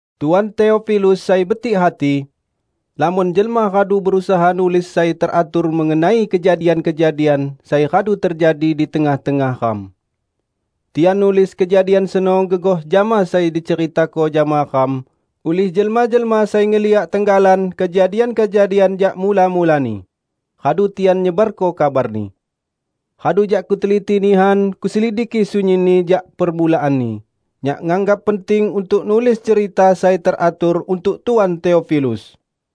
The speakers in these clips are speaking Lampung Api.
Tuan Teofilus sai betik hati, Lamon jelma radu berusaha nulis sai teratur mengenai kejadian-kejadian sai radu tejadi di tengah-tengah ram. Tian nulis kejadian seno gegoh jama sai diceritako jama ram ulih jelma-jelma sai ngeliyak tenggalan kejadian-kejadian jak mula-mulani, radu tian nyebarko kabarni. Radu jak kuteliti nihan kuselidiki sunyinni jak permulaanni, nyak nganggap penting untuk nulis cerita sai teratur untuk Tuan Teofilus.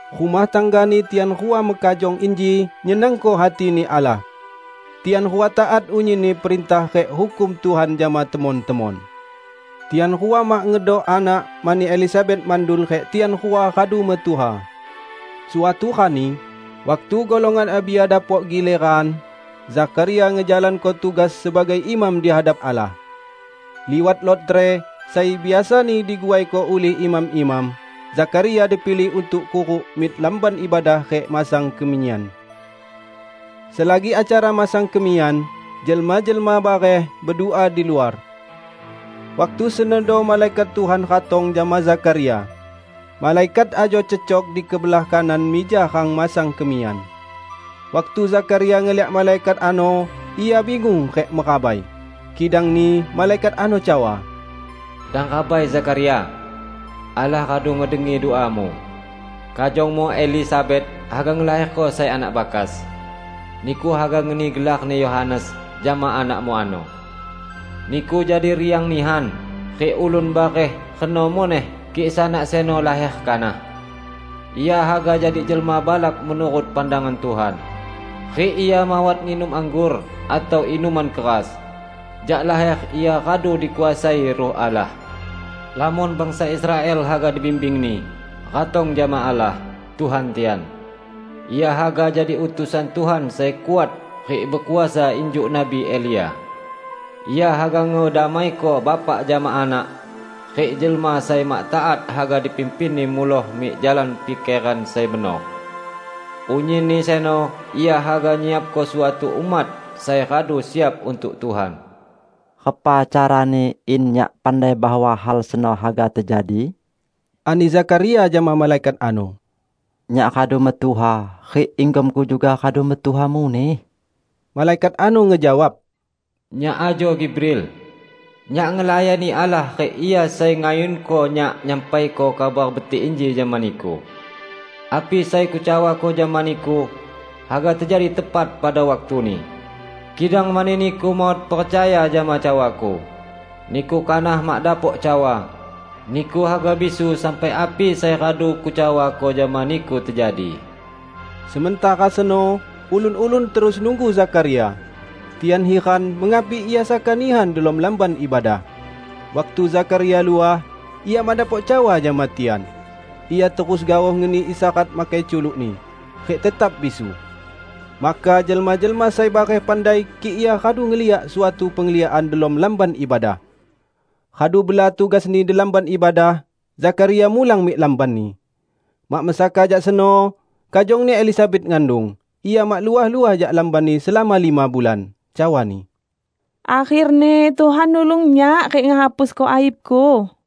Rumah tanggani tian rua mekajong inji nyenangko hati-Ni Allah. Tian rua taat unyinni perintah rik Hukum Tuhan jama temon-temon. Tian rua mak ngedok anak mani Elisabet mandul rik tian rua radu metuha. Suatu rani, waktu golongan Abia dapok gileran, Zakharia ngejalanko tugas sebagai imam di hadap Allah. Liwat lotre, sai biasani diguaiko ulih imam-imam, Zakharia dipilih untuk kuruk mik Lamban Ibadah rik masang kemiyan. Selagi acara masang kemiyan, jelma-jelma bareh bedua diluar. Waktu senodo malaikat Tuhan ratong jama Zakharia. Malaikat ajo cecok di kebelah kanan mija rang masang kemiyan. Waktu Zakharia ngeliak malaikat ano, ia bingung rik merabai. Kidangni malaikat ano cawa, "Dang rabai, Zakharia! Allah radu ngedengi duamu. Kajongmu Elisabet haga ngelaherko sai anak bakas. Niku haga ngeni gelarni Yohanes jama anakmu ano. Niku jadi riang nihan rik ulun bareh reno muneh kik sanak seno laher kanah! Ia haga jadi jelma balak menurut pandangan Tuhan, rik ia mawat nginum anggor atau inuman keras. Jak laher ia radu dikuasai Ruh Allah. Lamon bangsa Israel haga dibimbingni, ratong jama Allah, Tuhan tian. Ia haga jadi utusan Tuhan sai kuat rik bekuasa injuk nabi Elia. Ia haga ngedamaiko bapak jama anak, rik jelma sai mak taat haga dipimpinni muloh mik jalan pikeran sai benor. Unyinni seno ia haga nyiapko suatu umat sai radu siap untuk Tuhan." "Repa carani in nyak pandai bahwa hal seno haga tejadi?" ani Zakharia jama malaikat ano. "Nyak radu metuha, rik inggomku juga radu metuha muneh." Malaikat ano ngejawab, "Nyak ajo Gibril. Nyak ngelayani Allah rik Ia sai ngayunko nyak nyampaiko kabar betik inji jama niku. Api sai kucawako jama niku, haga tejadi tepat pada waktuni. Kidang mani niku mawat percaya jama cawaku, niku kanah mak dapok cawa, niku haga bisu sampai api sai radu kucawako jama niku tejadi." Sementara seno, ulun-ulun terus nunggu Zakharia. Tian hiran mengapi ia saka nihan delom Lamban Ibadah. Waktu Zakharia luah, ia mak dapok cawa jama tian. Ia terus gaoh ngeni isyarat makai culukni, rik tetap bisu. Maka jelma-jelma sai bareh pandai kik ia radu ngeliak suatu pengliakan delom Lamban Ibadah. Radu bela tugasni di Lamban Ibadah, Zakharia mulang mik lambanni. Mak mesaka jak seno, kajongni Elisabet ngandung, ia mak luah-luah jak lambanni selama lima bulan. Cawani, "Akherni Tuhan nulung nyak rik ngehapusko aibku."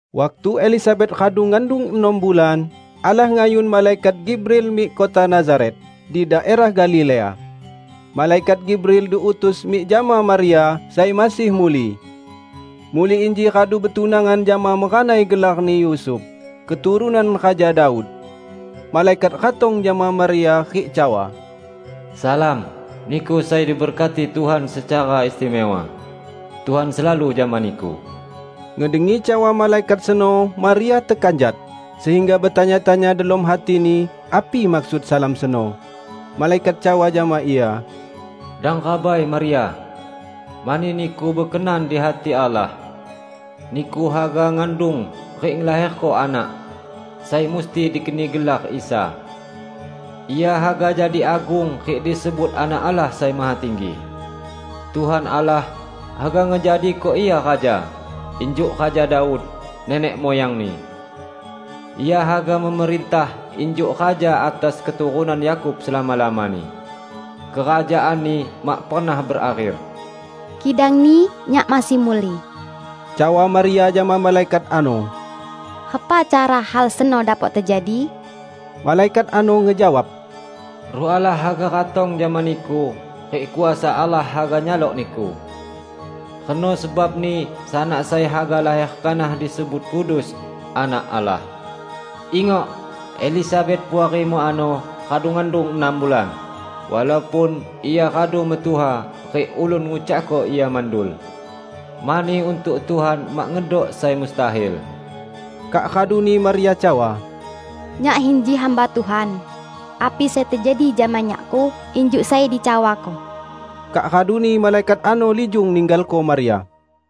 Waktu Elisabet radu ngandung enam bulan, Allah ngayun malaikat Gibril mik kota Nazaret, di daerah Galilea. Malaikat Gibril diutus mik jama Maria sai masih muli. Muli inji radu betunangan jama meranai gelarni Yusuf, keturunan Raja Daud. Malaikat ratong jama Maria rik cawa, "Salam, niku sai diberkati Tuhan secara istimewa! Tuhan selalu jama niku!" Ngedengi cawa malaikat seno Maria tekanjat, sehingga betanya-tanya delom hatini api maksud salam seno. Malaikat cawa jama ia, "Dang rabai, Maria, mani niku bekenan di hati Allah. Niku haga ngandung rik ngelaherko anak, sai musti dikeni gelar Isa. Ia haga jadi agung rik disebut Anak Allah Sai Mahatinggi. Tuhan Allah haga ngejadiko Ia raja, injuk Raja Daud, nenek muyangni. Ia haga memerintah injuk raja atas keturunan Yakub selama-lamani. Kerajaan-Ni mak pernah berakher." "Kidangni, nyak masih muli," cawa Maria jama malaikat ano, "repa cara hal seno dapok tejadi?" Malaikat ano ngejawab, "Ruh Allah haga ratong jama niku, rik kuasa Allah haga nyalok niku. Reno sebabni sanak sai haga laher kanah disebut Kudus, Anak Allah. Ingok: Elisabet, puarimu ano radu ngandung enam bulan, walaupun ia radu metuha rik ulun ngucakko ia mandul. Mani untuk Tuhan mak ngedok sai mustahil." Kak raduni Maria cawa, "Nyak inji hamba Tuhan; api sai tejadi jama nyakku injuk sai dicawako." Kak raduni malaikat ano lijung ninggalko Maria.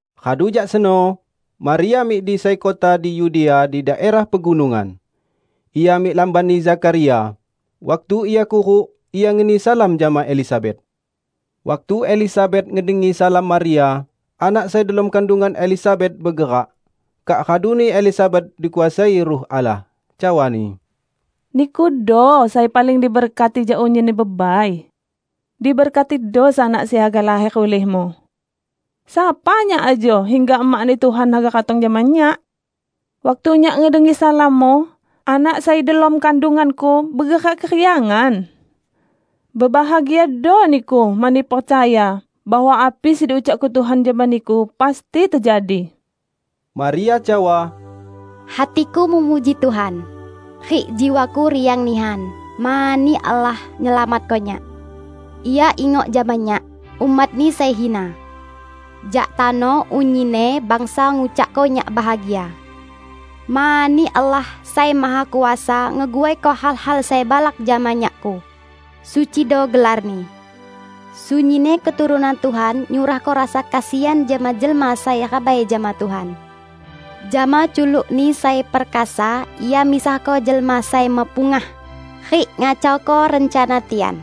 Radu jak seno, Maria mik di sai kota di Yudea di daerah pegunungan. Ia mik lambanni Zakharia, waktu ia kuruk, ia ngeni salam jama Elisabet. Waktu Elisabet ngedengi salam Maria, anak sai delom kandungan Elisabet begerak. Kak raduni Elisabet dikuasai Ruh Allah, cawani, "Nikudo sai paling diberkati jak unyinni bebai! Diberkatido sanak sai haga laher ulihmu! Sapa nyak ajo hingga emakni Tuhan haga ratong jama nyak? Waktu nyak ngedengi salammu, anak sai delom kandunganku begerak keriangan. Bebahagiado niku, mani percaya bahwa api sai diucakko Tuhan jama niku pasti tejadi!" Maria cawa, "Hatiku memuji Tuhan, rik jiwaku riang nihan mani Allah nyelamatko nyak. Ia ingok jama nyak, umat-Ni sai hina! Jak tano unyinni bangsa ngucakko nyak bahagia. Mani Allah sai Mahakuasa ngeguaiko hal-hal sai balak jama nyakku. Sucido gelar-Ni. Sunyinni keturunan Tuhan nyurahko rasa kesian jama jelma sai rabai jama Tuhan. Jama culuk-Ni sai perkasa Ia misahko jelma sai mepungah, rik ngacauko rencana tian.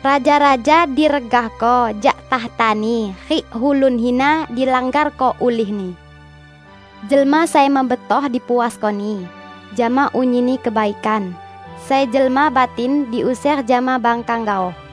Raja-raja diregahko jak takhtani rik ulun hina dilanggarko ulihni. Jelma sai mebetoh dipuasko-Ni, jama unyinni kebaikan, sai jelma batin diuser jama bangkang gaoh.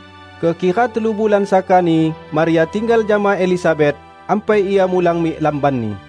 Kekira telu bulan sakani Maria tinggal jama Elisabet, ampai ia mulang mik lambanni.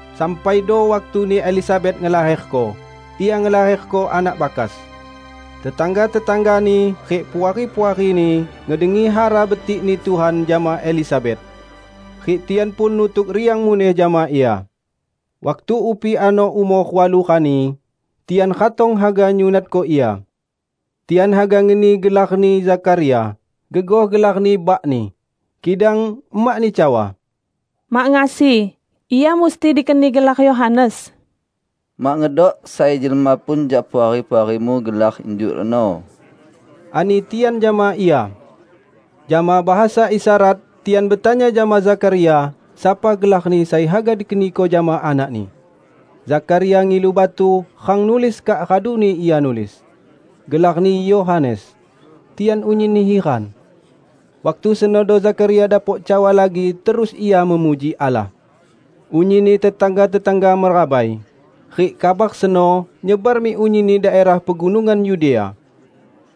Sampaido waktuni Elisabet ngelaherko. Ia ngelaherko anak bakas. Tetangga-tetanggani rik puari-puarini ngedengi hara betik-Ni Tuhan jama Elisabet, rik tian pun nutuk riang muneh jama ia. Waktu upi ano umor walu rani, tian ratong haga nyunatko ia. Tian haga ngeni gelarni Zakharia gegoh gelarni bakni, kidang emakni cawa, "Mak ngasi! Ia musti dikeni gelar Yohanes." "Mak ngedok sai jelma pun jak puari-puarimu gelar injuk reno," ani tian jama ia. Jama bahasa isyarat, tian betanya jama Zakharia sapa gelarni sai haga dikeniko jama anakni. Zakharia ngilu batu rang nulis kak raduni ia nulis, "Gelarni Yohanes." Tian unyinni hiran. Waktu senodo Zakharia dapok cawa lagi terus ia memuji Allah. Unyinni tetangga-tetangga merabai, rik kabar seno nyebar mik unyinni daerah pegunungan Yudea.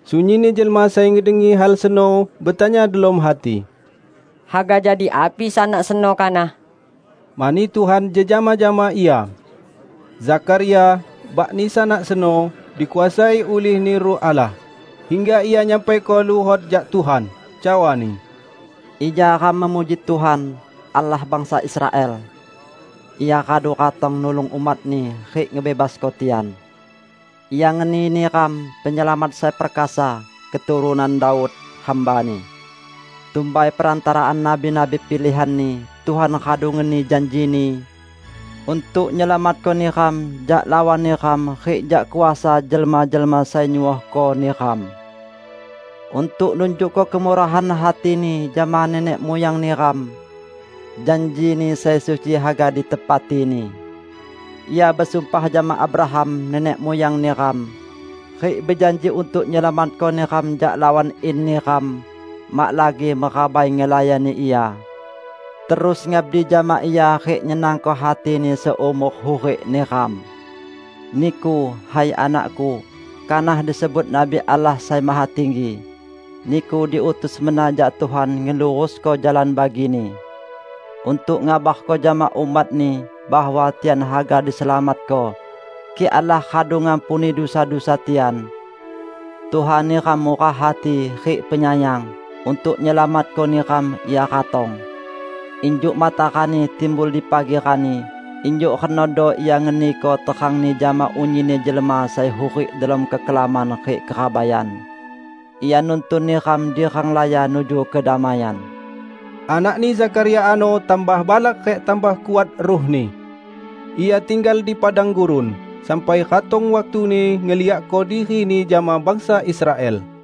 Sunyinni jelma sai ngedengi hal seno betanya delom hati, "Haga jadi api sanak seno kanah?" Mani Tuhan jejama jama Ia. Zakharia, bakni sanak seno, dikuasai ulih-Ni Ruh Allah, hingga ia nyampaiko luhot jak Tuhan, cawani, "Ija ram memuji Tuhan, Allah bangsa Israel! Ia radu ratong nulung umat-Ni rik ngebebasko tian. Ia ngeni neram penyelamat sai perkasa, keturunan Daud, hamba-Ni. Tumbai perantaraan nabi-nabi pilihan-Ni, Tuhan radu ngeni janji-Ni untuk nyelamatko neram jak lawan neram rik jak kuasa jelma-jelma sai nyuohko neram. Untuk nunjukko kemurahan hati-Ni jama nenek muyang neram, janji-Ni sai suci haga ditepati-Ni. Ia besumpah jama Abraham nenek muyang neram, rik bejanji untuk nyelamatko neram jak lawan in neram, mak lagi merabai ngelayani Ia terus ngabdi jama Ia rik nyenangko hati-Ni seumor hurik neram. Niku, hai anak-Ku, kanah disebut nabi Allah Sai Mahatinggi. Niku diutus mena jak Tuhan ngelurusko jalan bagi-Ni, untuk ngabarko jama umat-Ni bahwa tian haga diselamatko, kik Allah radu ngampuni dusa-dusa tian. Tuhan neram murah hati rik penyayang; untuk nyelamatko neram Ia ratong. Injuk matarani timbul di pagi rani, injuk renodo Ia ngeniko terang-Ni jama unyinni jelma sai hurik delom kekelaman rik kerabaian. Ia nuntun neram di renglaya nuju kedamaian." Anakni Zakharia ano tambah balak rik tambah kuat ruhni. Ia tinggal di padang gurun, sampai ratong waktuni ngeliakko dirini jama bangsa Israel.